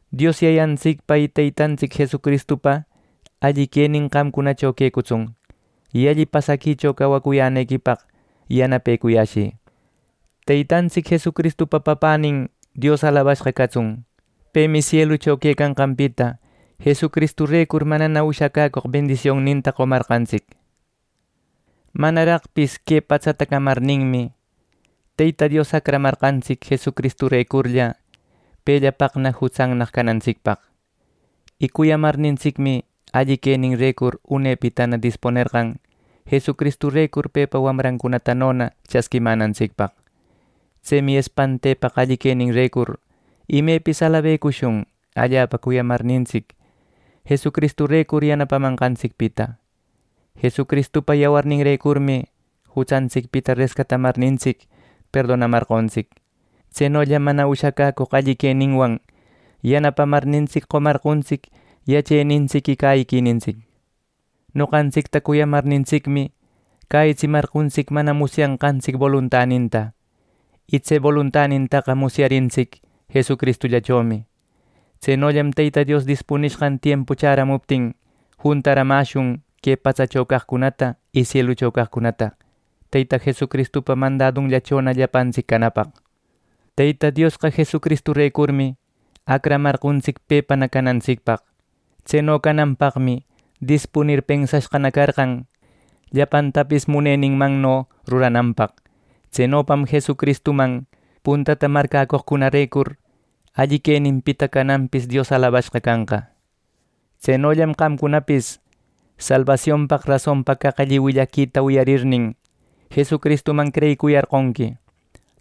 Dios Yayantsicpa y Teytantsic Jesucristupa alli quenin qamcunacho quecutsun, y alli pasaquicho cawacuyänequipaq yanapecuyäshï. ¡Teytantsic Jesucristupa Papänin Dios alabashqa catsun! Pemi sielucho quecanqanpita Jesucristurecur manana ushacaq bendisionnincunata qomarqantsic. Manaraqpis que patsata camarninmi, Teyta Dios acramarqantsic Jesucristurecurlla, pellapaqna jutsannaq canantsicpaq. Y cuyamarnintsicmi, alli queninrecur unepitana dispunerqan Jesucristurecur pepa wamrancunatanona chasquimänantsicpaq. Tsemi espantepaq alli queninrecur imepis alabecushun allapa cuyamarnintsic, Jesucristurecur yanapamanqantsicpita. Jesucristupa yawarninrecurmi jutsantsicpita rescatamarnintsic perdonamarqontsic. Tsenollam mana ushacäcoq alli queninwan yanapamarnintsic, qomarqontsic yachenintsic y cäyiquinintsic. Noqantsicta cuyamarnintsicmi, cäyitsimarqontsic mana musyashqantsic boluntaninta, y tse boluntanintaqa musyarintsic Jesucristuchomi. Tsenollam Teyta Dios dispunishqan tiempu chäramuptin juntaramäshun que patsacho caqcunata y sielucho caqcunata Teyta Jesucristupa mandadunllächona llapantsic canapaq. Teyta Diosqa Jesucristurecurmi acramarqontsic pepana canantsicpaq. Tseno cananpaqmi dispunir pensashqana carqan llapantapis muneninmanno rurananpaq. Tsenopam Jesucristuman puntata marcäcoqcunarecur alli queninpita cananpis Dios alabashqa canqa. Tsenollam qamcunapis salbasionpaq rasonpa caq alli willaquita wiyarirnin, Jesucristuman creyicuyarqonqui.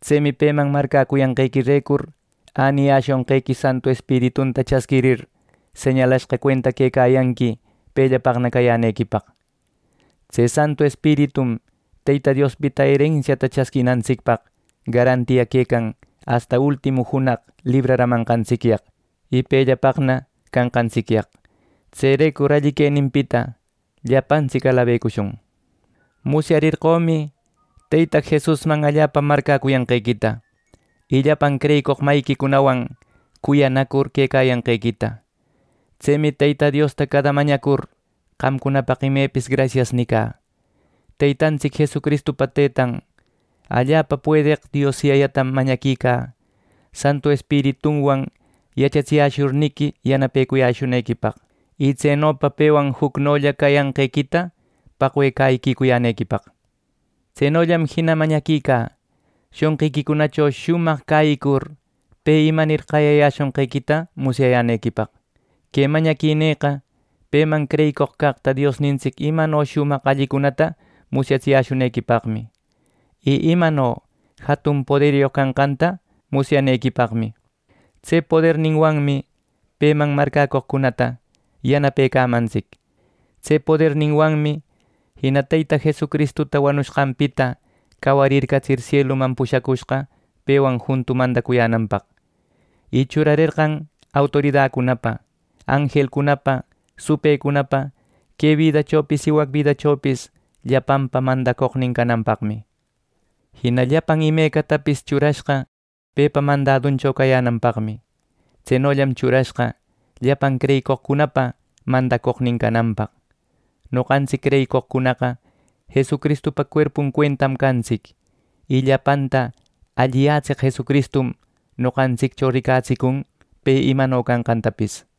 Tsemi peman marcäcuyanqequirecur äniyäshonqequi Santu Espiritunta chasquirir, señalashqa cuenta quecayanqui pellapaqna cayänequipaq. Tse Santu Espiritum Teyta Diospita erensiata chasquinantsicpaq garantia quecan asta ultimu junaq libraramanqantsicyaq, y pellapaqna canqantsicyaq. ¡Tserecur alli queninpita llapantsic alabecushun! Musyarerqömi Teyta Jesusman allapa marcäcuyanqequita, y llapan creyicoq mayiquicunawan cuyanacur quecayanqequita. Tsemi Teyta Diosta cada mañacur qamcunapaq imepis “grasias” nicä. Teytantsic Jesucristupa Teytan, allapa puedeq Dios Yayatam mañaquicä, Santu Espiritunwan yachatsiyäshurninqui yanapecuyäshunequipaq, y tsenopa pewan jucnolla cayanqequita paqwe cäyiquicuyänequipaq. Tsenollam jina mañaquicä shonqiquicunacho shumaq cäyicur pe imanir qayayäshonqequita musyayänequipaq. Que mañaquinïqa peman creyicoq caqta Diosnintsic imano shumaq allicunata musyatsiyäshunequipaqmi. Y imano jatun poderyoq canqanta musyanequipaqmi. Tse poderninwanmi peman marcäcoqcunata yanapecamantsic. Tse poderninwanmi jina Teyta Jesucristuta wanushqanpita cawarircatsir sieluman pushacushqa pewan juntu mandacuyänanpaq, y churarerqan autoridacunapa, anjelcunapa, supëcunapa, que bidachopis y wac bidachopis llapanpa mandacoqnin cananpaqmi. Jina llapan imecatapis churashqa pepa mandaduncho cayänanpaqmi. Tsenollam churashqa llapan creyicoqcunapa mandacoqnin cananpaq. Noqantsic creyicoqcunaqa Jesucristupa cuerpun cuentam cantsic, y llapanta alliyätseq Jesucristum noqantsiccho ricatsicun pe imano canqantapis.